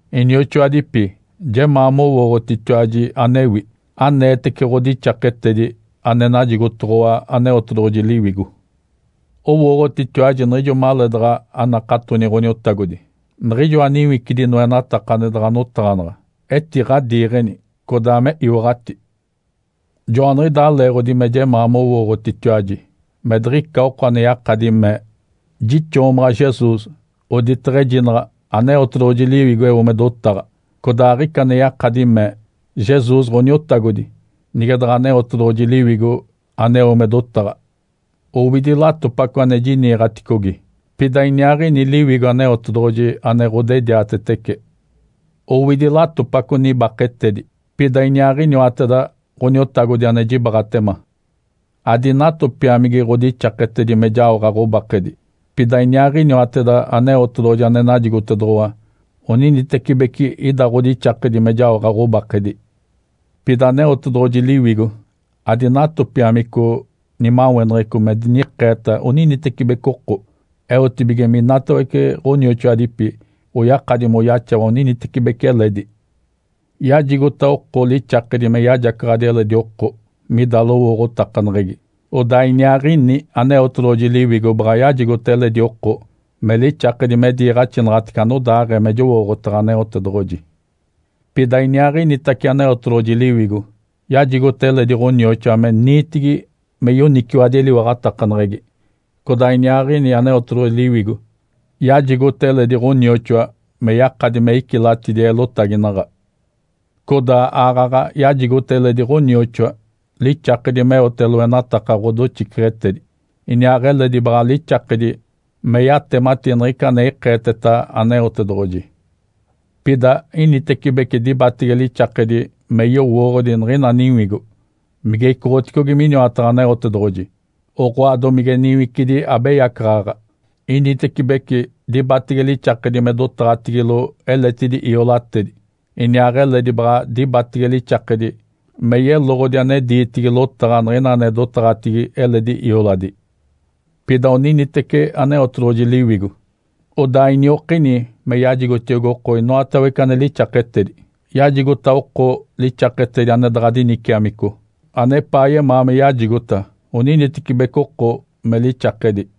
Inioxoadipi, jemaa mowooɡ̶otitiwaji anewi aneetece ɡ̶odixaketedi ane najigotoɡ̶owa Aneotedoɡ̶oji Liwigo. Owooɡ̶otitiwaji niɡ̶ijo maleedaɡ̶a anakatoni Ǥoniotagodi, niɡ̶ijoa niwicidi noenataka ane daɡ̶a notaɡ̶anaɡ̶a etiɡ̶adiiɡ̶eni, codaa me iwaɡ̶ati. Joaniɡ̶idaa leeɡ̶odi me jemaa mowooɡ̶otitiwaji me diɡ̶ica oko ane yakadi mee, “Jixoomaɡ̶a Jesus”, oditaɡ̶a ejinaɡ̶a Aneotedoɡ̶oji Liwigo eo me dotaɡ̶a. Codaa aɡ̶ica ane yakadi mee, “Jesus Ǥoniotagodi”, nige daɡ̶a Aneotedoɡ̶oji Liwigo aneo me dotaɡ̶a. Owidi latopaco ane jiniiɡ̶aticogi, pida iniaaɡ̶ini Liwigo Aneotedoɡ̶oji ane ɡ̶odediatetece. Owidi latopaco nibaketedi, pida iniaaɡ̶iniwateda Ǥoniotagodi ane jibaaɡ̶atema. Adinatopiamigi ɡ̶odixaketedi me jaoɡ̶a ɡ̶obakedi, pida iniaaɡ̶iniwateda Aneotedoɡ̶oji ane najigotoɡ̶owa oninitecibeci ida ɡ̶odixakedi me jaoɡ̶a ɡ̶obakedi. Pida Aneotedoɡ̶oji Liwigo adinatopiamico nimaweneɡ̶eco me dinikeeta oninitecibeci oko, eotibige minatawece ɡ̶onioxoadipi oyakadi moyaxawa oninitecibeci eledi. Yajigota oko lixakedi me yajacaɡ̶adi eledi oko mida lowooɡ̶otakaneɡ̶egi, odaa iniaaɡ̶ini Aneotedoɡ̶oji Liwigo baɡ̶a yajigota eledi oko me lixakedi me diiɡ̶axinaɡ̶atece anodaaɡ̶ee me jowooɡ̶otaɡ̶a Aneotedoɡ̶oji. Pida iniaaɡ̶initace Aneotedoɡ̶oji Liwigo yajigota eledi ɡ̶onioxoa me niitigi me yoniciwadi eliwaɡ̶atakaneɡ̶egi, codaa iniaaɡ̶ini Aneotedoɡ̶oji Liwigo yajigota eledi ɡ̶onioxoa me yakadi me icilatidi eelotaginaɡ̶a. Codaa aaɡ̶aɡ̶a yajigota eledi ɡ̶onioxoa lixakedi meote loenataka ɡ̶odoxiceɡ̶etedi, iniaaɡ̶eledi baɡ̶a lixakedi me yatemati niɡ̶ica ane ikeeteta Aneotedoɡ̶oji. Pida initecibece dibatege lixakedi me yowooɡ̶odi niɡ̶ina niwigo mige icoɡ̶oticogi miniwataɡ̶a Aneotedoɡ̶oji, oɡ̶oa domige niwicidi abeyacaɡ̶aɡ̶a. Initecibece dibatege lixakedi me dotaɡ̶atigilo eletidi iolatedi, iniaaɡ̶eledi baɡ̶a dibatege lixakedi me yeloɡ̶odi ane diitigi lotaɡ̶a niɡ̶ina ane dotaɡ̶atigi eledi ioladi. Pida oninitece Aneotedoɡ̶oji Liwigo, odaa iniokini me yajigotiogi oko inoatawece ane lixaketedi. Yajigota oko lixaketedi ane daɡ̶a diniciamico, anepaa yemaa me yajigota oninitecibeci oko me lixakedi.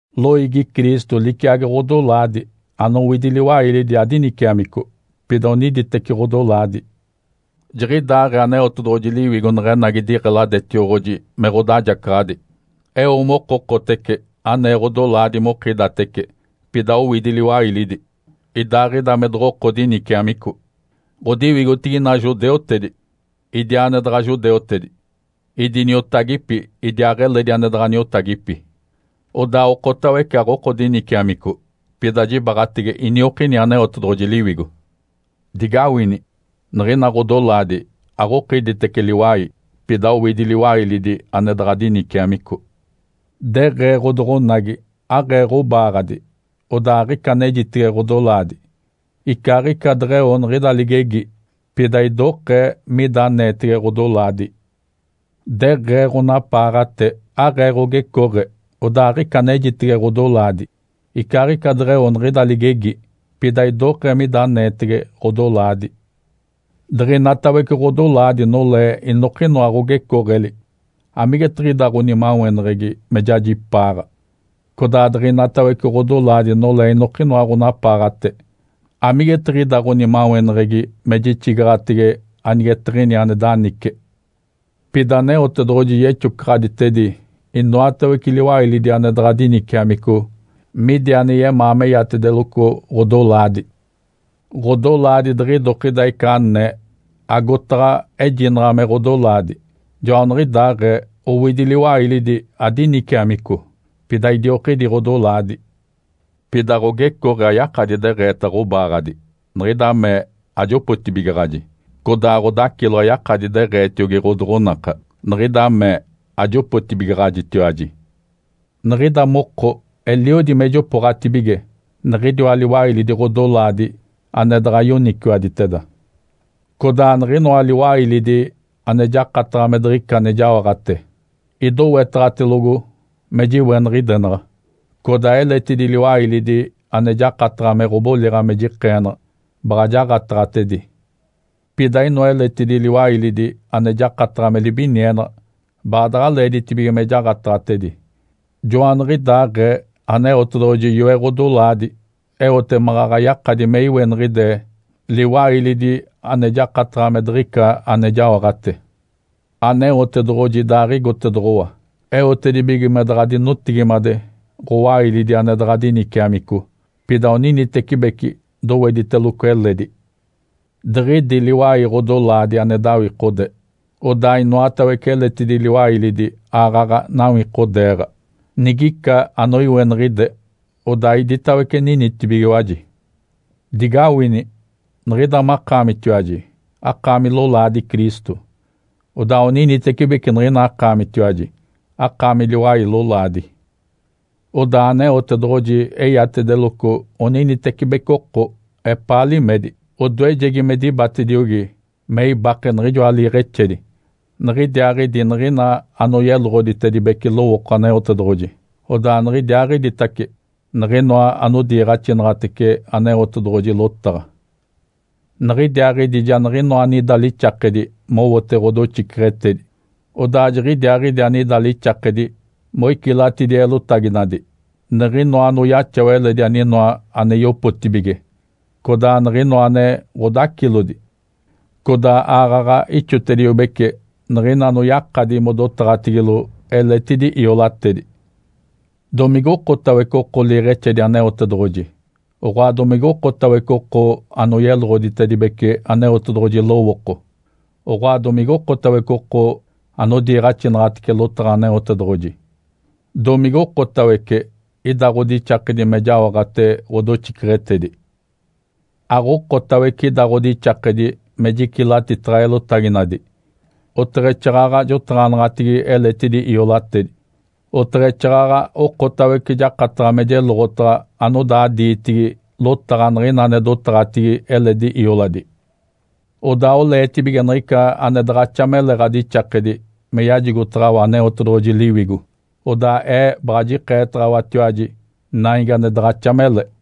Loiigi Cristo liciagi ɡ̶odolaadi anowidi liwailidi adiniciamico, pida oniditeci ɡ̶odolaadi. Jiɡ̶idaaɡ̶ee Aneotedoɡ̶oji Liwigo neɡ̶enagi diɡ̶eladetioɡ̶oji me ɡ̶odajacaɡ̶adi, eo mokokotece anee ɡ̶odolaadi mokidatece pida owidi liwailidi, idaaɡ̶ida me doɡ̶oko diniciamico. Ǥodiwigotigi ina judeutedi, idiaa ane daɡ̶a judeutedi; idi niotagipi idiaaɡ̶eledi ane daɡ̶a niotagipi. Odaa okotawece aɡ̶oko diniciamico, pida jibaɡ̶atege iniokini Aneotedoɡ̶oji Liwigo. Digawini! Niɡ̶ina ɡ̶odolaadi aɡ̶okiditece liwai, pida owidi liwailidi ane daɡ̶a diniciamico. Deɡ̶ee ɡ̶odoɡ̶onagi, “Aɡ̶ee ɡ̶obaaɡ̶adi, odaa aɡ̶ica anejitege ɡ̶odolaadi.” Icaaɡ̶ica deɡ̶eo niɡ̶ida ligegi, pida idokee mida aneetege ɡ̶odolaadi. Deɡ̶ee ɡ̶onapaaɡ̶ate, “Aɡ̶ee ɡ̶ogecooɡ̶e, odaa aɡ̶ica anejitege ɡ̶odolaadi.” Icaaɡ̶ica deɡ̶eo niɡ̶ida ligegi, pida idokee mida aneetege ɡ̶odolaadi. Diɡ̶inatawece ɡ̶odolaadi nolee inokinoa ɡ̶ogecooɡ̶eli, amigetiɡ̶ida ɡ̶onimaweneɡ̶egi me jajipaaɡ̶a, codaa diɡ̶inatawece ɡ̶odolaadi nolee inokinoa ɡ̶onapaaɡ̶ate, amigetiɡ̶ida ɡ̶onimaweneɡ̶egi me jixigaɡ̶ate anigetiɡ̶ini ane danice? Pida Aneotedoɡ̶oji yexocaɡ̶aditedi inoatawece liwailidi ane daɡ̶a diniciamico midi ane yemaa meyatedeloco ɡ̶odolaadi. Ǥodolaadi diɡ̶idokida ica anee, agotaɡ̶a ejinaɡ̶a me ɡ̶odolaadi. Joaniɡ̶idaaɡ̶ee owidi liwailidi adiniciamico, pida idiokidi ɡ̶odolaadi. Pida ɡ̶ogecooɡ̶e ayakadi deɡ̶eeta ɡ̶obaaɡ̶adi, “Niɡ̶ida mee ajopotibigaɡ̶aji!”, codaa ɡ̶odacilo ayakadi deɡ̶eetiogi ɡ̶odoɡ̶onaka, “Niɡ̶ida mee ajopotibigaɡ̶ajitiwaji!” Niɡ̶ida moko eliodi me jopooɡ̶atibige niɡ̶idiwa liwailidi ɡ̶odolaadi ane daɡ̶a yoniciwaditeda. Codaa niɡ̶inoa liwailidi ane jakataɡ̶a me diɡ̶ica ane jaoɡ̶ate, idowetaɡ̶atelogo me jiweniɡ̶idenaɡ̶a. Codaa eletidi liwailidi ane jakataɡ̶a me ɡ̶oboliɡ̶a me jikeenaɡ̶a, baɡ̶a jaɡ̶ataɡ̶atedi. Pida inoa eletidi liwailidi ane jakataɡ̶a me libinienaɡ̶a, baadaɡ̶a leeditibige me jaɡ̶ataɡ̶atedi. Joaniɡ̶idaaɡ̶ee Aneotedoɡ̶oji yoe ɡ̶odolaadi eote maɡ̶aɡ̶a yakadi me iweniɡ̶ide liwailidi ane jakataɡ̶a me diɡ̶ica ane jaoɡ̶ate. Aneotedoɡ̶oji idaaɡ̶igotedoɡ̶owa eotedibige me daɡ̶a dinotigimade ɡ̶owailidi ane daɡ̶a diniciamico, pida oniditecibeci dowediteloco eledi. Diɡ̶idi liwai ɡ̶odolaadi ane dawikode, odaa inoatawece eletidi liwailidi aaɡ̶aɡ̶a nawikodeeɡ̶a. Nigica anoiweniɡ̶ide, odaa iditawece ninitibigiwaji. Digawini! Niɡ̶ida makaamitiwaji akaami lolaadi Cristo, odaa oninitecibeci niɡ̶ina akaamitiwaji akaami liwai lolaadi. Odaa Aneotedoɡ̶oji eyatedeloco oninitecibeci oko epaa limedi. Odoejegi me dibatediogi me ibake niɡ̶ijoa liiɡ̶exedi, niɡ̶idiaaɡ̶idi niɡ̶ina anoyeloɡ̶oditedibece lowooko Aneotedoɡ̶oji, odaa niɡ̶idiaaɡ̶iditace niɡ̶inoa anodiiɡ̶axinaɡ̶atece Aneotedoɡ̶oji lotaɡ̶a. Niɡ̶idiaaɡ̶idi ja niɡ̶inoa anida lixakedi mowote ɡ̶odoxiceɡ̶etedi, odaa jiɡ̶idiaaɡ̶idi anida lixakedi moicilatidi eelotaginadi, niɡ̶inoa anoyaxawa eledi aninoa ane yopotibige, codaa niɡ̶inoa ane ɡ̶odacilodi, codaa aaɡ̶aɡ̶a ixotediobece niɡ̶ina anoyakadi modotaɡ̶atigilo eletidi iolatedi. Domigokotawece oko liiɡ̶exedi Aneotedoɡ̶oji, oɡ̶oa domigokotawece oko anoyeloɡ̶oditedibece Aneotedoɡ̶oji lowooko, oɡ̶oa domigokotawece oko anodiiɡ̶axinaɡ̶atece lotaɡ̶a Aneotedoɡ̶oji? Domigokotawece ida ɡ̶odixakedi me jaoɡ̶ate ɡ̶odoxiceɡ̶etedi? Aɡ̶okotawece ida ɡ̶odixakedi me jicilatitaɡ̶a eelotaginadi, oteɡ̶exaaɡ̶aɡ̶a jotaɡ̶anaɡ̶atigi eletidi iolatedi, oteɡ̶exaaɡ̶aɡ̶a okotawece jakataɡ̶a me jeloɡ̶otaɡ̶a anodaa diitigi lotaɡ̶a niɡ̶ina ane dotaɡ̶atigi eledi ioladi. Odaa oleetibige niɡ̶ica ane daɡ̶axa mele ɡ̶adixakedi me yajigotaɡ̶awa Aneotedoɡ̶oji Liwigo. Odaa ee baɡ̶a jikeetaɡ̶awatiwaji naigi ane daɡ̶axa mele.